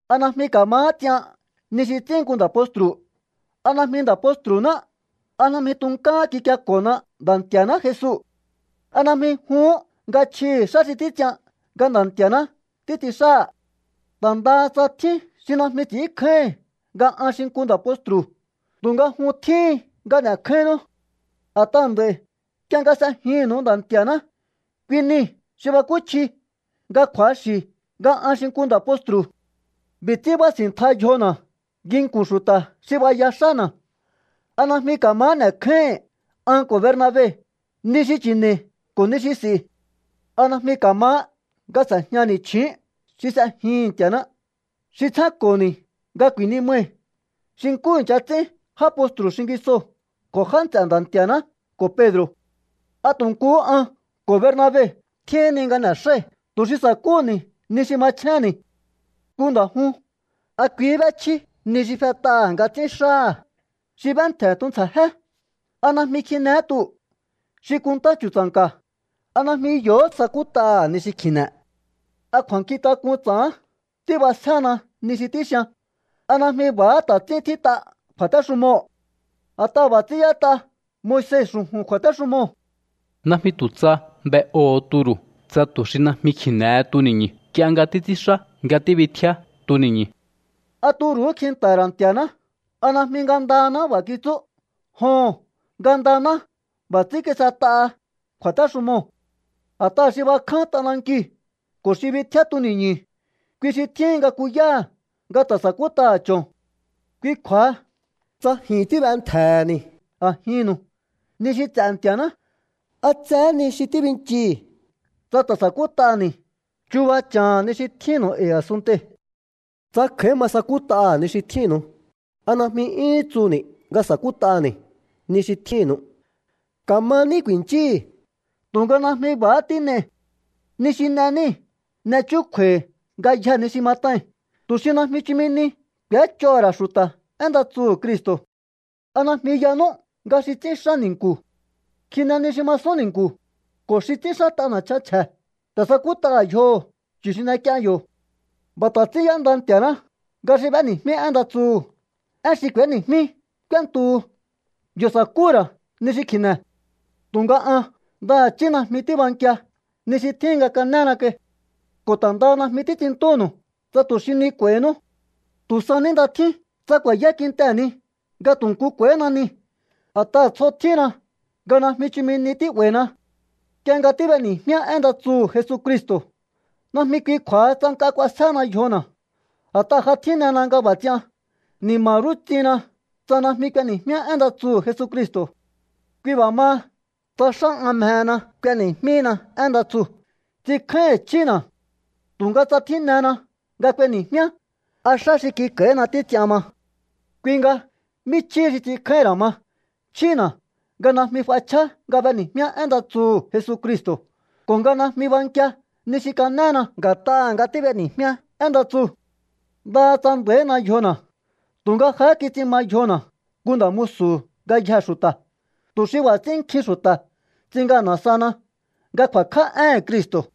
¿A najmi ka̱mahá ts'ian ni xi ts'ín nku nda̱ postru̱? ¿A najmi nda̱ postru̱ná? ¿A najmi tunkáhán kikieko̱hona Nda̱ Nti̱a̱ná Jesu? ¿A najmi juhún nga chjihi̱ xá xi títs'ian nga Nda̱ Nti̱a̱ná títs'in xáha̱? Ta̱ ndaha tsa tjín xi najmi ts'ínkjáíhi̱n nga an xi nku nda̱ postru̱, tu̱nga jun tjíhin nga n'e̱kjáínnú. A̱t'aha̱ nd'a̱i̱ nk'ie nga s'ejinnu̱u Nda̱ Nti̱a̱ná, kui niu̱ xi bakúchji nga kju̱axi̱ nga an xi nku nda̱ postru̱. B'i̱ ts'ín bási̱ntja yjona̱ nginku̱n xu̱ta̱ xi b'aya xána̱. ¿A najmi ka̱mahá n'e̱kjáíhi̱n an ko̱ Bernabe ni xi chi̱ne̱i̱ ko̱ ni xi s'i̱? ¿A najmi ka̱mahá nga s'e̱jñani̱ chju̱ún xi s'ejihi̱n Nti̱a̱ná, xi tsjénko̱ni̱ nga ku̱i̱nimai̱ xi nkú i̱ncha ts'ín já postru̱ xingisoo̱ ko̱ já nts'e̱ Nda̱ Nti̱a̱ná ko̱ Pedro̱? ¿A tu̱ nkuhú an ko̱ Bernabe tjíhinni nga n'e̱xái̱ tu̱ xi sa̱kúhu̱ni̱ ni xi machjénni̱? Nku nda̱ jun, ¿a kuihí b'échjí ni xi fet'aha̱ nga ts'ín xáha̱? Xi b'éntje̱ tuntsja̱jé, ¿a najmi kjinehé tuu̱? Xi kunntá chu̱tsa̱nka̱, ¿a najmi yo̱hó sakút'aha̱ ni xi kji̱ne̱? ¿A kju̱a̱nkjintak'un ts'a̱hán tíb'asjéhena ni xi tíxian? ¿A najmi b'a̱há ta̱ ts'ín tjít'a kju̱a̱téxumoo̱? A̱t'aha̱ b'a̱ ts'ín y'ét'a Moise xu̱ju̱n kju̱a̱téxumoo̱: “Najmi tu̱ tsa b'e'oho̱o turu̱ tsa tu̱ xi najmi kji̱ne̱he tuni̱ñu̱ nk'ie nga títs'ínxá nga tíbitjíá tuni̱ñu̱.” ¿A turu̱hú kjinta̱ha̱ ra̱ Nti̱a̱ná? ¿A najmi ngandanáhá b'a̱ kitsú? Joho̱n, ngandaná b'a̱ ts'ín kis'et'aha kju̱a̱téxumoo̱. A̱t'aha̱ xi bakján t'anankiu̱ ko̱ xi bitjíá tuni̱ñu̱, kui xi tjíhin nga kúyaha̱ nga ta̱ sa̱kút'aha̱ cho̱n. Kui kju̱a̱ha, tsa ji̱n tíb'entje̱he̱ni̱ a̱jinnu̱u ni xi ts'e̱ Nti̱a̱ná, ¿a tsehé ni xi tíbinchii̱ tsa ta̱ sakút'ani̱ chuba cha̱ha̱n ni xi tjínnu̱u e̱i̱ a̱sunntei̱? Tsa kj'a̱í ma sakút'aha̱ ni xi tjínnu̱u, ¿a najmi 'yúhún tsuhu̱ni̱ nga sakút'ani̱ ni xi tjínnu̱u? Ka̱maní ku̱i̱nchíi̱, tu̱nga najmi b'a̱há tín'ei̱. Ni xi n'e níi̱, n'e chúkju̱a̱i̱ ngayjee̱ ni xi mat'ai̱n tu̱ xi najmi chumi ni k'u̱éch'oho̱ ra̱ xu̱ta̱ én nda tsuhu̱ Cristo̱. ¿A najmi yanú nga xi ts'ínxá ni̱nku̱ kjine ni xi masún ni̱nku̱ ko̱ xi ts'ínxát'a na̱chan chje̱ ta̱ sakút'aha̱ yjoho̱ chu̱ xi n'ek'ien yo̱? B'a̱ ta̱ ts'ín y'énda Nti̱a̱ná nga xi b'éni̱jmí én nda tsuhu̱, én xi k'u̱éni̱jmí k'úéntuhu. Yo̱ sa̱kúhu̱ ra̱ ni xi kji̱ne̱. Tu̱nga an ndaha̱chí najmi tíbankia ni xi tjíhin nga ka̱néna kai. Ko̱ ta̱ ndaha najmi títs'inntúnu̱u tsa tu̱ xi ni k'u̱a̱i̱hinú. Tu̱ sa ní nda tjín tsa ku̱a̱yá kintehe̱ ni nga tu̱ nku k'u̱a̱i̱hína ni, a̱t'aha̱ tsjo tjínna nga najmi chumi ni tí'ba̱i̱na. Nk'ie nga tíb'eni̱jmíá én nda tsuhu̱ Jesucristo̱, najmi kui kju̱a̱ha tsa nk'a k'uasjéhena yjona̱. A̱t'aha̱ ja tjínena nga b'a̱ ts'ian. ¡Ni̱ma̱ rú ts'ihinna tsa najmi k'ueni̱jmíá én nda tsuhu̱ Jesucristo̱! Kui b'a̱ maha, tsa xá an mjehena k'ueni̱jmíhina én nda tsuu̱, ts'inkjáíhi̱n chjína̱. Tu̱nga tsa tjínena nga k'ueni̱jmíá, a̱ xá xi kik'a̱i̱hína títs'ian ma. Kui nga, ¿mí chjíhi xi ts'inkjáíhín ra̱ ma? Chjína̱ nga najmi f'achjá nga b'eni̱jmíá én nda tsuhu̱ Jesucristo̱ ko̱ nga najmi bankia ni xi kanéna nga̱t'aha̱ nga tíb'eni̱jmíá én nda tsuu̱. Ndaha tsa nda̱ína yjona̱, tu̱nga jahá kits'in ma yjona̱ nku nda̱ musu̱hu̱ ngayjee̱ xu̱ta̱, tu̱ xi b'a̱ ts'ín nkjin xu̱ta̱ ts'in ngana̱ sahana nga ku̱a̱kj'á éhe̱n Cristo̱.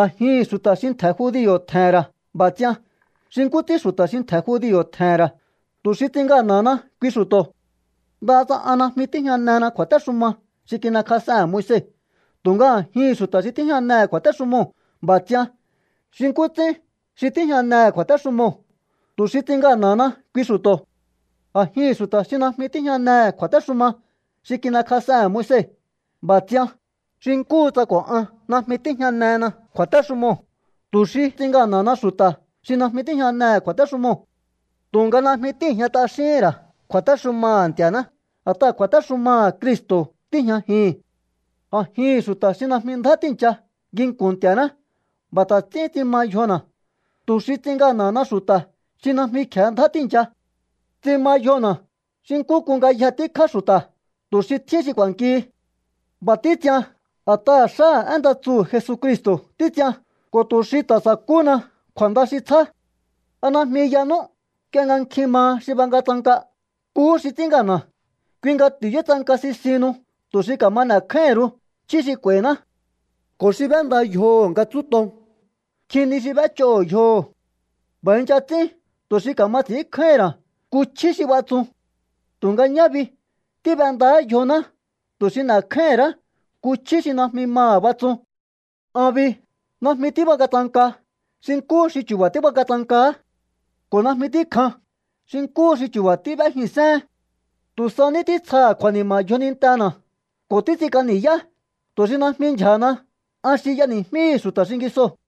A̱jihi̱n xu̱ta̱ xi ntje̱ judio̱ tje̱he̱n ra̱ b'a̱ ts'ian xi nkú ts'ín xu̱ta̱ xi ntje̱ judio̱ tje̱he̱n ra̱, tu̱ xi ts'in ngana̱hana kui xu̱to̱. Ndaha tsa an najmi tíjñanena kju̱a̱téxuma xi kin'ekjas'ehe̱n Moise, tu̱nga a̱jihi̱n xu̱ta̱ xi tíjñanehe̱ kju̱a̱téxumoo̱ b'a̱ ts'ian xi nkú ts'ín xi tíjñanehe̱ kju̱a̱téxumoo̱, tu̱ xi ts'in ngana̱hana kui xu̱to̱. A̱jihi̱n xu̱ta̱ xi najmi tíjñanehe̱ kju̱a̱téxuma xi kin'ekjas'ehe̱n Moise b'a̱ ts'ian xi nkúhu tsa ko̱ an najmi tíjñanena kju̱a̱téxumoo̱, tu̱ xi ts'in ngana̱hana xu̱ta̱ xi najmi tíjñanehe̱ kju̱a̱téxumoo̱. Tu̱nga najmi tíi̱jña t'axíhín ra̱ kju̱a̱téxumaha̱ Nti̱a̱ná, a̱t'aha̱ kju̱a̱téxumaha̱ Cristo̱ tíi̱jñajihi̱n. A̱jihi̱n xu̱ta̱ xi najmi ndjá tíi̱ncha nginku̱n Nti̱a̱ná b'a̱ ta̱ ts'ín ts'in ma yjona̱, tu̱ xi ts'in ngana̱hana xu̱ta̱ xi najmi kje̱ ndjá tíi̱ncha. Ts'in ma yjona̱ xi nkú k'un ngayje tíkjá xu̱ta̱ tu̱ xi tjín xi k'u̱a̱nkihi. B'a̱ títs'ian a̱t'aha̱ xáha̱ én nda tsuhu̱ Jesucristo̱ títs'ian ko̱ tu̱ xi ta̱ sa̱kúhuna kju̱a̱nda xi tsjá. ¿A najmi yanú, nk'ie nga nkjin maha xi bangatsanka, nkuhú xi ts'ín ngana̱? Kui nga ti̱yútsanka sisihinnu tu̱ xi ka̱ma n'e̱kjáíhi̱n ru̱u chjí xi k'u̱a̱i̱ná. Ko̱ xi b'énda yjoho̱ nga tsúton, nkjin ni xi b'éch'oho̱ yjoho̱. B'a̱ i̱ncha ts'ín tu̱ xi ka̱ma ts'i̱ínkjáíhi̱n ra̱ nku chjí xi batsun. Tu̱nga ñá bi, tíb'endaá yjoná tu̱ xi n'e̱kjáíhi̱n ra̱á nku chjí xi najmi maha̱ batsun. An bi, najmi tíbangatsanka xi nkúhu xi chu̱ba̱ tíbangatsankahá ko̱ najmi tíkjan xi nkúhu xi chu̱ba̱ tíb'éjin séhén. Tu̱ sa ní títsjaha̱ kju̱a̱ni̱ma̱ yjonintena̱ ko̱ títs'ink'a ni̱yá, tu̱ xi najmi ndyja̱hana an xi y'eni̱jmíhi̱ xu̱ta̱ xingisoo̱.